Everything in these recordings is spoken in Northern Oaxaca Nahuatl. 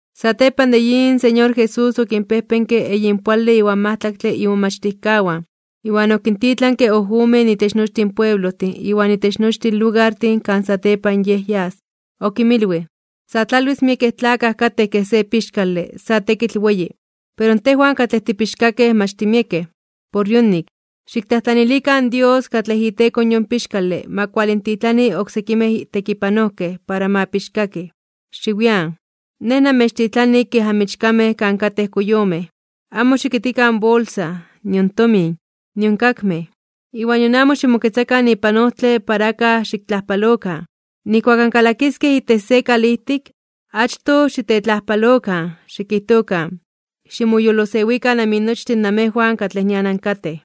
Satepan de yin, in Señor Jesús okinpejpenke eyinpoale iwan majtlaktle imomachtijkawan, iwan okintitlanke ojomen itech nochtin pueblojtin iwan itech nochtin lugartin kan satepan Yej yas. Okinmilwij: ―Sa tlalwis miekej tlakaj katej kej se pixkale sa tekitl weyi, pero tejwan katlej tipixkakej mach timiekej. Por yonik, xiktlajtlanilikan in Dios katlej iteko in yon pixkale ma kualintitlani oksekimej tekipanojkej para ma pixkakij. Xiwian. Nej namechtitlani kej amichkamej kan katej koyomej. Amo xikitkikan bolsa, nion tomin, nion kakmej. Iwan nion amo ximoketzakan ipan ojtle para akaj xiktlajpalokan. Nijkuak ankalakiskej itech se kalijtik, achtoj xitetlajpalokan, xikijtokan: “Ximoyolosewikan aminochtin namejwan katlej nian ankatej.”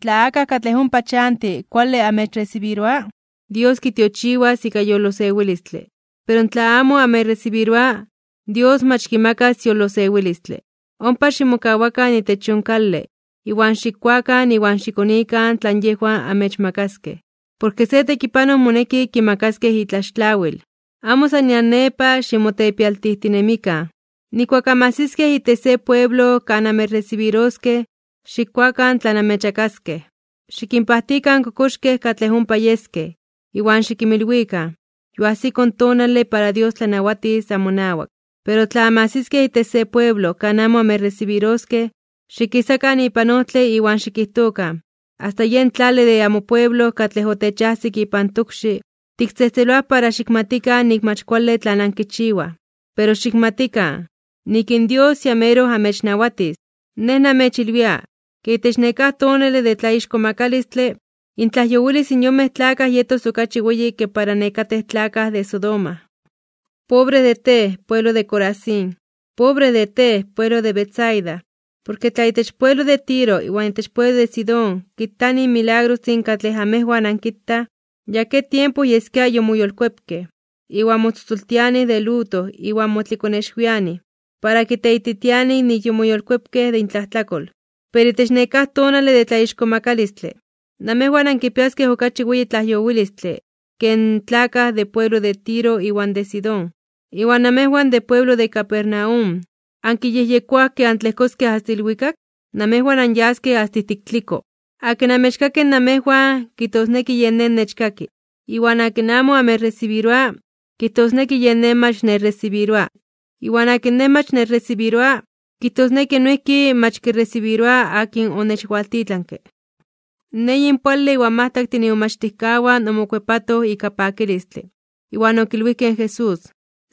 Tla akaj katlej ompa chanti kuale amechresibiroa, Dios kitiochiwas ika yolosewilistle. Pero tla amo amechresibiroa, Dios mach kimakas yolosewilistle. Ompa ximokawakan itech yon kale, iwan xikkuakan iwan xikonikan tlan yejwan amechmakaskej. Porke se tekipanoj moneki kimakaskej itlaxtlawil. Amo san nian nepa ximotepialtijtinemikan (ximokalotijtinemikan). Nijkuak anmajsiskej itech se pueblo kan amechresibiroskej, xikkuakan tlan amechmakaskej. Xikinpajtikan in kokoxkej katlej ompa yeskej, iwan xikinmilwikan: “Yoajsiko in tonale para Dios tlanawatis amonawak.” Pero tla anmajsiskej itech se pueblo kan amo amechresibiroskej, xikisakan ipan ojtle iwan xikijtokan: “Asta yen tlale de amopueblo katlej otechajsik ipan tokxi, tiktzejtzeloaj para xikmatikan nik mach kuale tlan ankichiwaj. Pero xikmatikan, nik in Dios ya meroj amechnawatis.” Nej namechilwia, ke itech nekáj tonale de tlaixkomakalistle (tlatzonmanalos), intlajyowilis in yonmej tlakaj yetos okachi weyi ke para nekatej tlakaj de Sodoma. ’¡Pobre de tej, pueblo de Corazín! ¡Pobre de tej, pueblo de Betsaida! Porke tla itech pueblo de Tiro iwan itech pueblo de Sidón kitanij in milagrostin katlej amejwan ankitaj, ya ke tiempo yeskia yomoyolkuepkej. Iwan motzotzoltianij de luto iwan motlikonexwianij, para kiteititianij nik yomoyolkuepkej de intlajtlakol. Pero itech nekáj tonale de tlaixkomakalistle (tlatzonmanalos), namejwan ankipiaskej okachi weyi tlajyowilistle ke in tlakaj de pueblo de Tiro iwan de Sidón. Iwan namejwan de pueblo de Capernaum, ¿ankiyejyekoaj ke antlejkoskej asta ilwikak? Namejwan anyaskej asta ijtik tliko. ’Akin amechkaki namejwan, kijtosneki yen Nej nechkaki. Iwan akin amo amechresibiroa, kijtosneki yen Nej mach nechresibiroa. Iwan akin Nej mach nechresibiroa, kijtosneki noijki mach kiresibiroa akin onechwaltitlanke. In eyinpoale iwan majtlaktin imomachtijkawan omokuepatoj ika pakilistle, iwan okilwijkej in Jesús: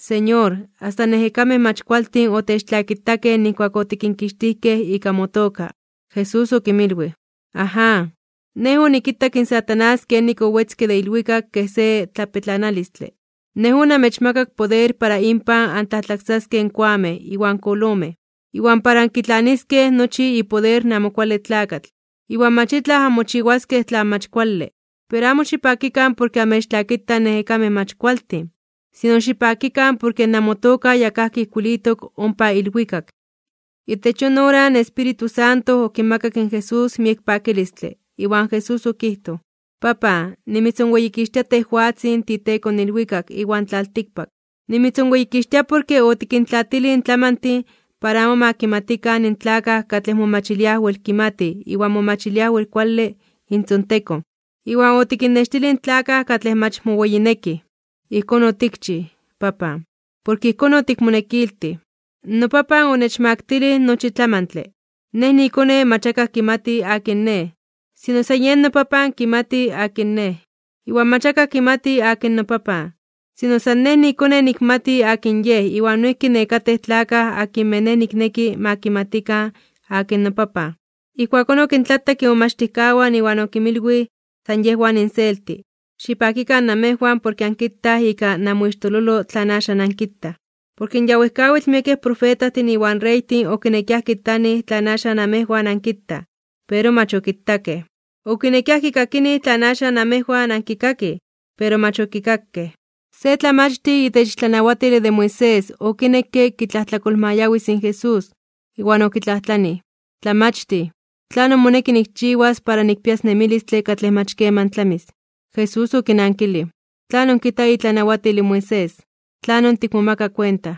―Señor, asta in ejekamej mach kualtin otechtlakitakej nijkuak otikinkixtijkej ika motoka. Jesús okinmilwij: ―Aján, Nej onikitak in Satanás kenik owetzke de ilwikak kej se tlapetlanalistle. Nej onamechmakak poder para inpan antlajtlaksaskej in koamej iwan kolomej, iwan para ankitlaniskej nochi ipoder in Amo Kuale Tlakatl, iwan mach itlaj anmochiwaskej tlan mach kuale. Pero amo xipakikan porke amechtlakitaj in ejekamej mach kualtin, sino xipakikan porke namotoka ya kajki ijkuilitok ompa ilwikak. Itech yon ora in Espíritu Santo okimakak in Jesús miek pakilistle, iwan Jesús okijtoj: ―Papan, nimitzonweyikixtia tejwatzin tiiTeko in ilwikak iwan tlaltikpak. Nimitzonweyikixtia porke otikintlaatilij in tlamantin para amo ma kimatikan in tlakaj katlej momachiliaj wel kimatij iwan momachiliaj wel kuale intzontekon, iwan otikinnextilij in tlakaj katlej mach moweyinekij. Ijkón otikchij, Papan, porke ijkón otikmonekiltij. ’NoPapan onechmaktilij nochi tlamantle. Nej niiKone mach akaj kimati akin Nej, sino san yen noPapan kimati akin Nej. Iwan mach akaj kimati akin noPapan, sino san Nej niiKone nikmati akin Yej iwan noijki nekatej tlakaj akinmej Nej nikneki ma kimatikan akin noPapan. Ijkuakón okintlatak imomachtijkawan iwan okinmilwij san yejwan inselti: ―Xipakikan namejwan porke ankitaj ika namoixtololo tlan axan ankitaj. Porke ya wejkawitl miekej profetajtin iwan reytin okinekiaj kitanij tlan axan namejwan ankitaj, pero mach okitakej. Okinekiaj kikakinij tlan axan namejwan ankikakij, pero mach okikakej. Se tlamachtij itech tlanawatile de Moisés okinekke kitlajtlakolmayawis in Jesús, iwan okitlajtlanij: ―Tlamachtij, ¿tlanon moneki nikchiwas para nikpias nemilistle katlej mach keman tlamis? Jesús okinankilij: ―¿Tlanon kijta itlanawatil in Moisés? ¿Tlanon tikmomaka kuenta?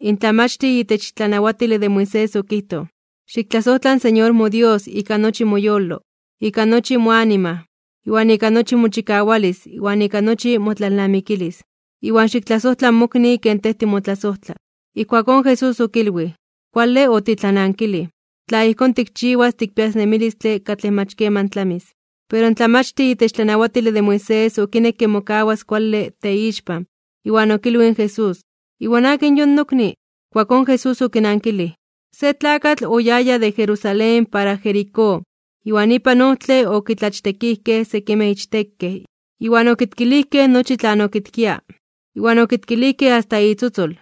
In tlamachtij itech tlanawatile de Moisés okijtoj: ―“Xiktlasojtla in Señor moDios ika nochi moyolo, ika nochi moanima, ika nochi mochikawalis iwan ika nochi motlalnamikilis. Iwan xiktlasojtla mokni ken tej timotlasojtla.” Ijkuakón Jesús okilwij: ―Kuale otitlanankilij. Tla ijkón tikchiwas tikpias nemilistle katlej mach keman tlamis. Pero in tlamachtij itech tlanawatile de Moisés okinekke mokawas kuale teixpan, iwan okilwij in Jesús: ―¿Iwan akin yon nokni? Ijkuakón Jesús okinankilij: ―Se tlakatl oyaya de Jerusalén para Jericó, iwan ipan ojtle okitlachtekijkej sekimej ichtekej iwan okitkilijkej nochi tlan okitkia, iwan okitkilijkej asta itzotzol.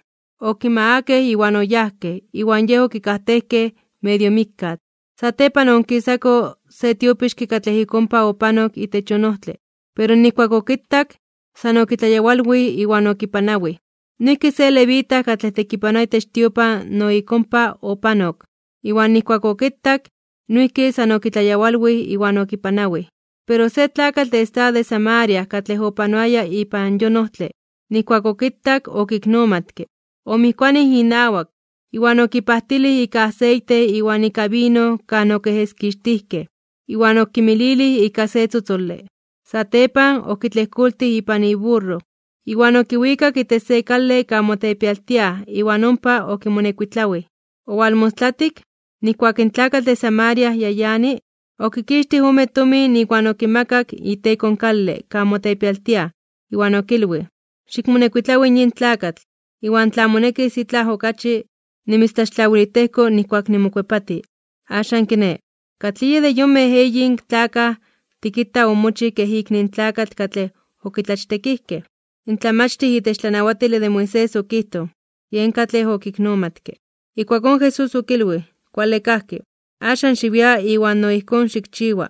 Okimagakej iwan oyajkej, iwan yej okikajtejkej medio mikkatl. Satepan oonkisako se tiopixke katlej ik ompa opanok itech yon ojtle. Pero nijkuak okitak, san okitlayawalwij iwan okipanawij. Noijki se levita katlej tekipanoa itech tiopan no ik ompa opanok, iwan nijkuak okitak, noijki san okitlayawalwij iwan okipanawij. Pero se tlakatl de estado de Samaria katlej opanoaya ipan yon ojtle, nijkuak okitak, okiknomatke. Omijkuanij inawak, iwan okipajtilij ika aseite iwan ika vino kan okiejeskixtijkej, iwan okimililij ika se tzotzole. Satepan, okitlejkoltij ipan iburro, iwan okiwikak itech se kale kan motepialtiaj (mokalotiaj) iwan ompa okimonekuitlawij. Owalmostlatik, nijkuak in tlakatl de Samaria ya yani, okixtij ome tomin iwan okimakak iteko in kale kan motepialtiaj, iwan okilwij: “Xikmonekuitlawi yin tlakatl, iwan tla monekis itlaj okachi, nimitztlaxtlawilijtejko nijkuak nimokuepati.” Axan kiné, ¿katlij yej de yonmej eyin tlakaj tikita omochij kej ikni in tlakatl katlej okitlachtekijkej? In tlamachtij itech tlanawatile de Moisés okijtoj: ―Yen katlej okiknomatke. Ijkuakón Jesús okilwij: ―Kuale kajki. Axan xiwia iwan no ijkón xikchiwa.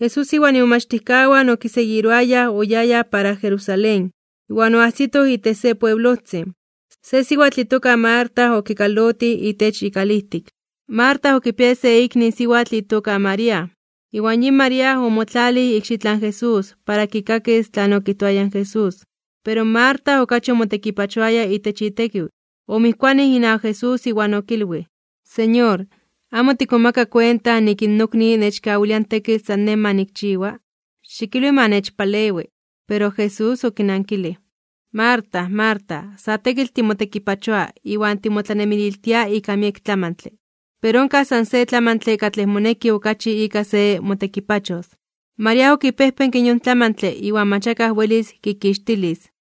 Jesús iwan imomachtijkawan okiseguiroayaj oyayaj para Jerusalén, iwan oajsitoj itech se pueblojtzin. Se siwatl itoka Marta okinkalotij itech ikalijtik. Marta okipiaya se ikni siwatl itoka María. Iwan yin María omotlalij ikxitlan Jesús para kikakis tlan okijtoaya in Jesús. Pero Marta okachi omotekipachoaya itech itekiw, omijkuanij inawak Jesús iwan okilwij: ―Señor, ¿amo tikmomaka kuenta nik in nokni nechkawilia in tekitl san nej ma nikchiwa? Xikilwi ma nechpalewi. Pero Jesús okinankilij: ―Marta, Marta, sa tekitl timotekipachoa iwan timotlanemililtia ika miek tlamantle. Pero onkaj san se tlamantle katlej moneki okachi ika se motekipachos. María okipejpenke yon tlamantle iwan mach akaj welis kikixtilis.